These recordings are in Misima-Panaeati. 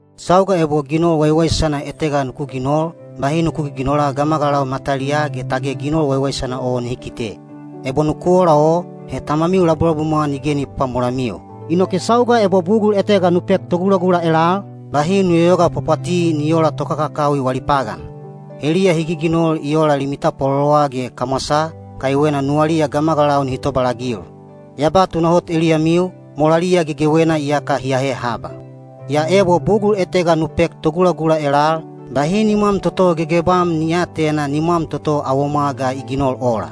Sauga ebo ginol waiwaisana etega nuku ginol, bahi nuku giginola gamagalau mataliyaa ge tage ginol waiwaisana o nihi kite. Ebo nuku ola o, he Tamamiu labulabumwa nige ni pwapwamolamiu. Inoke sauga ebo bugul etega nu pek togulagula elal, bahi nu yoyoga pwapwati ni oola tokakakawi wali pagan. Heliya hi giginol ola limi tapwalolowa ge kamwasaa, kaiwena nuwaliya gamagalau nihi tobalagil. Ya ba tunahot eliyamiu, molaliya gegewena iyaka hi ahe haba. Yaa ebo bugul etega nu pek togulagula elal, bahi nimwam toto gegebam ni aatena nimwam toto awomwa ga i ginol ola.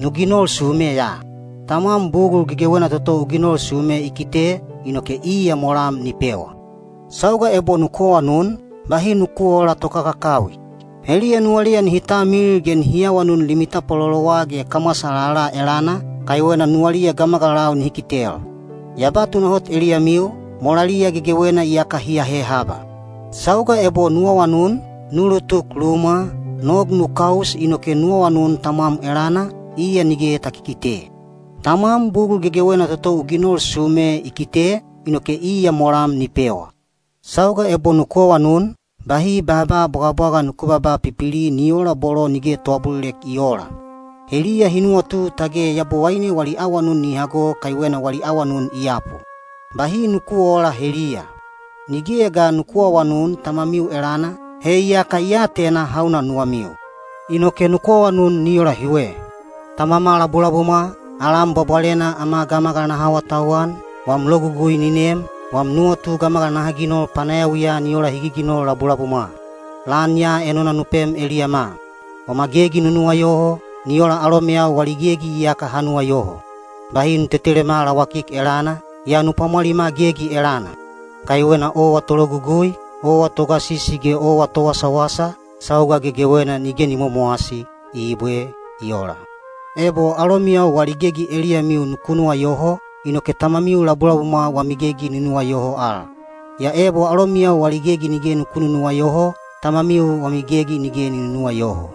Nu ginol sume ya. Tamwam bugul gegewena toto u ginol sume i kite, inoke iya molam ni pewa. Sauga ebo nuku awanun, bahi nuku oola tokakakawi. Heliya nuwaliya nihi talmilil ge nihi awanun limi tapwalolowa ge kamwasa lala elana, kaiwena nuwaliya gamagalau nihi kitel. Ya ba tunahot eliyamiu, molaliya gegewena iyaka hi ahe haba. Sauga ebo nu awanun, nu ulutuk lumwa, nog nu kaus inoke nu awanun Tamwam elana, iya nige ta kikite. Tamwam bugul gegewena toto u ginol sume i kite, inoke iya molam ni pewa. Sauga ebo nuku awanun, bahi baaba bwagabwaga nuku babaa pipili ni oola bolo nige toabulilek i oola. Heliya hi nuwatu tage Yabowaine wali awanun ni hago kaiwena wali awanun i yapu. Bahi nuku oola heliya. Nigeya ga nuku aawanun Tamamiu elana, he iyaka i atena hauna nuwamiu. Inoke nuku awanun ni ola hiwe: Tamama labulabumwa, alam bwabwalena ama gamagal naha awatauwan, wam logugui ni nem, wam nuwatu gamagal naha ginol panayawiya ni ola hi giginol labulabumwa. Lan ya enona nu pem eliyama. Wama gegi nu nuwayoho, ni ola alomeyau wali gegi iyaka ha nuwayoho. Bahi nu tetelema lawakik elana, yaa nu pwamwalima gegi elana. Kaiwena owa tologugui, owa togasisi ge owa towasawasa, sauga gegewena nige ni momowasi. Ibwe. I ola. Ebo alomiyau wali gegi eliyamiu nuku nuwayoho, inoke Tamamiu labulabumwa wami gegi ni nuwayoho al. Yaa ebo alomiyau wali gegi nige nuku nunuwayoho, Tamamiu wami gegi nige ni nunuwayoho.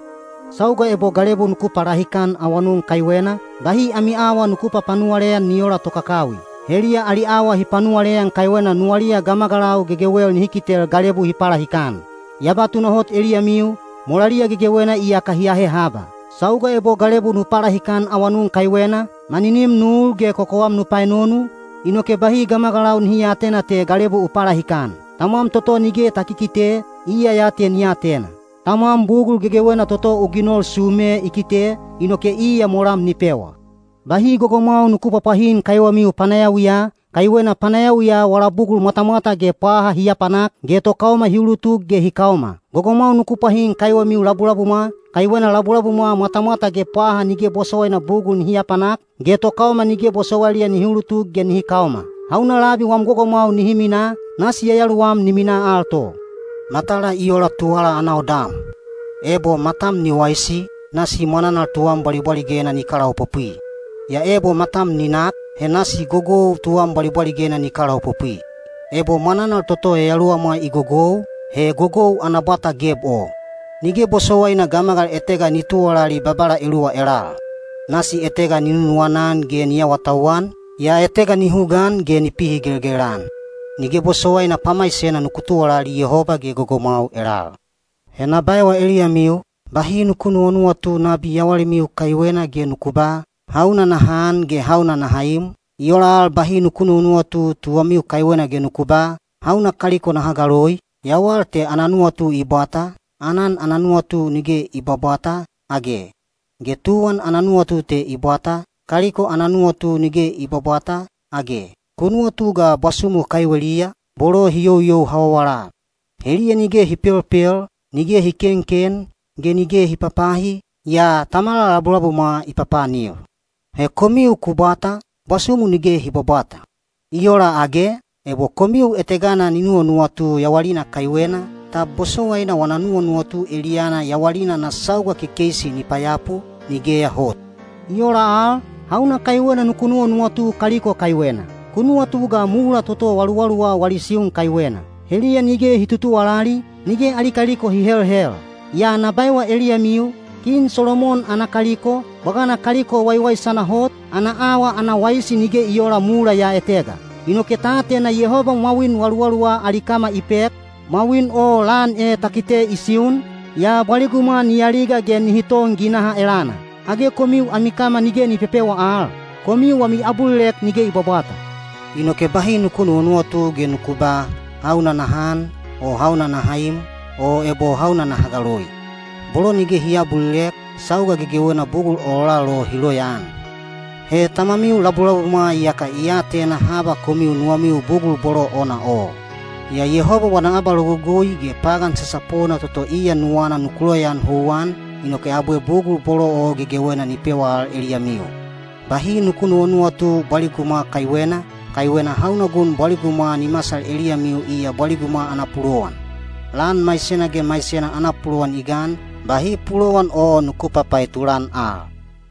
Sauga ebo galebu nuku palahikan awanun kaiwena, bahi ami awa nuku papanuwaleyan ni oola tokakakawi. Heliya ali awa hi panuwaleyan kaiwena nuwaliya gamagalau gegewel nihi kitel galebu hi palahikan. Ya ba tunahot eliyamiu, molaliya gegewena iyaka hi ahe haba. Sauga ebo galebu nu palahikan awanun kaiwena, maninim nu ul ge kokowam nu paenonu, inoke bahi gamagalau nihi aatena te galebu u palahikan. Tamwam toto nige ta kikite, iya ya te ni atena. Tamwam bugul gegewena toto u ginol sume i kite, inoke iya molam ni pewa. Bahi gogomwau nuku pwapwahin kaiwemiu panayawiya, kaiwena panayawiya wala bugul mwatamwata ge pwaha hi apanak, ge tokaoma hi ulutuk ge hi kaoma. Gogomwau nuku pwahin kaiwemiu labulabumwa, kaiwena labulabumwa mwatamwata ge pwaha nige bosowaina bugul nihi apanak, ge tokaoma nige bosowailiya nihi ulutuk ge nihi kaoma. Hauna labi wam gogomwau nihi minaa, nasi yayaluwam ni minaa al to. Matala i ola tuwala ana odam. Ebo matam ni waisi, nasi mwananal tuwam bwalibwaligena ni kalaopopwi. Yaa ebo matam ni nak, he nasi gogou tuwam bwalibwaligena ni kalaopopwi. Ebo mwananal toto yayaluwamwa i gogou, he gogou ana bwata geb o! Nige bosowaina gamagal etega ni tuwalali babala eluwa elal. Nasi etega ni nunuwana-an ge ni awatauwan, yaa etega ni hugaan ge ni pihigelgel-an. Nige bosowaina pamaisena nuku tuwalali Yehoba ge gogomwau elal. He na baewa eliyamiu, bahi nuku nuwanuwatu nabi yawalimiu kaiwena ge nuku ba, “Hauna naha an ge hauna naha im?” I ola al bahi nuku nuwanuwatu tuwamiu kaiwena ge nuku ba, “Hauna kaliko naha galoi?” Yawal te ana nuwatu i bwata, aanan ana nuwatu nige i bwabwata, age? Ge tuwan ana nuwatu te i bwata, kaliko ana nuwatu nige i bwabwata, age? Ku nuwatu ga bwasumu kaiweliya, bolo hi youyou hawawala. Heliya nige hi pelpel, nige hi kenken, ge nige hi papahi, yaa Tamamiu labulabumwa i papaanil. He komiu ku bwata, bwasumu nige hi bwabwata. I ola, age? Ebo komiu etegana ni nuwanuwatu yawalina kaiwena, tab bosowaina wana nuwanuwatu eliyana yawalina ana sauga kekeisi ni payapu? Nigeya hot! I ola al, hauna kaiwena nuku nuwanuwatu kaliko kaiwena? Ku nuwatu ga mula toto waluwaluwa wali siun kaiwena. Heliya nige hi tutuwalali, nige ali kaliko hi helhel. Yaa na baewa eliyamiu, kin Solomon ana kaliko, bwagana kaliko waiwaisana hot, ana awa ana waisi nige i oola mula ya etega. Inoke ta atena Yehoba mwawin waluwaluwa ali kama i pek, mwawin o lan e ta kite i siun, yaa bwaligumwa ni aliga ge nihi ton ginaha elana. Age komiu ami kama nige ni pepewa al? Komiu wami abulilek nige i bwabwata. Inoke bahi nuku nuwanuwatu ge nuku ba “Hauna naha an?” o “Hauna naha im?” o ebo “Hauna naha galoi?” Bolo nige hi aabulilek, sauga gegewena bugul ololal o hi loyaan. He Tamamiu labulabumwa iyaka i atena haba komiu nuwamiu bugul bolo ona o. Yaa Yehoba wana abalogugui ge pagan sasapona toto iya nuwana nuku loyaan houwan, inoke abwe bugul bolo o gegewena ni pewa al eliyamiu. Bahi nuku nuwanuwatu bwaligumwa kaiwena, kaiwena hauna gun bwaligumwa ni masal eliyamiu iya bwaligumwa ana pulowan. Lan maisena ge maisena ana pulowan i gan, bahi pulowan o nuku papaetulan al.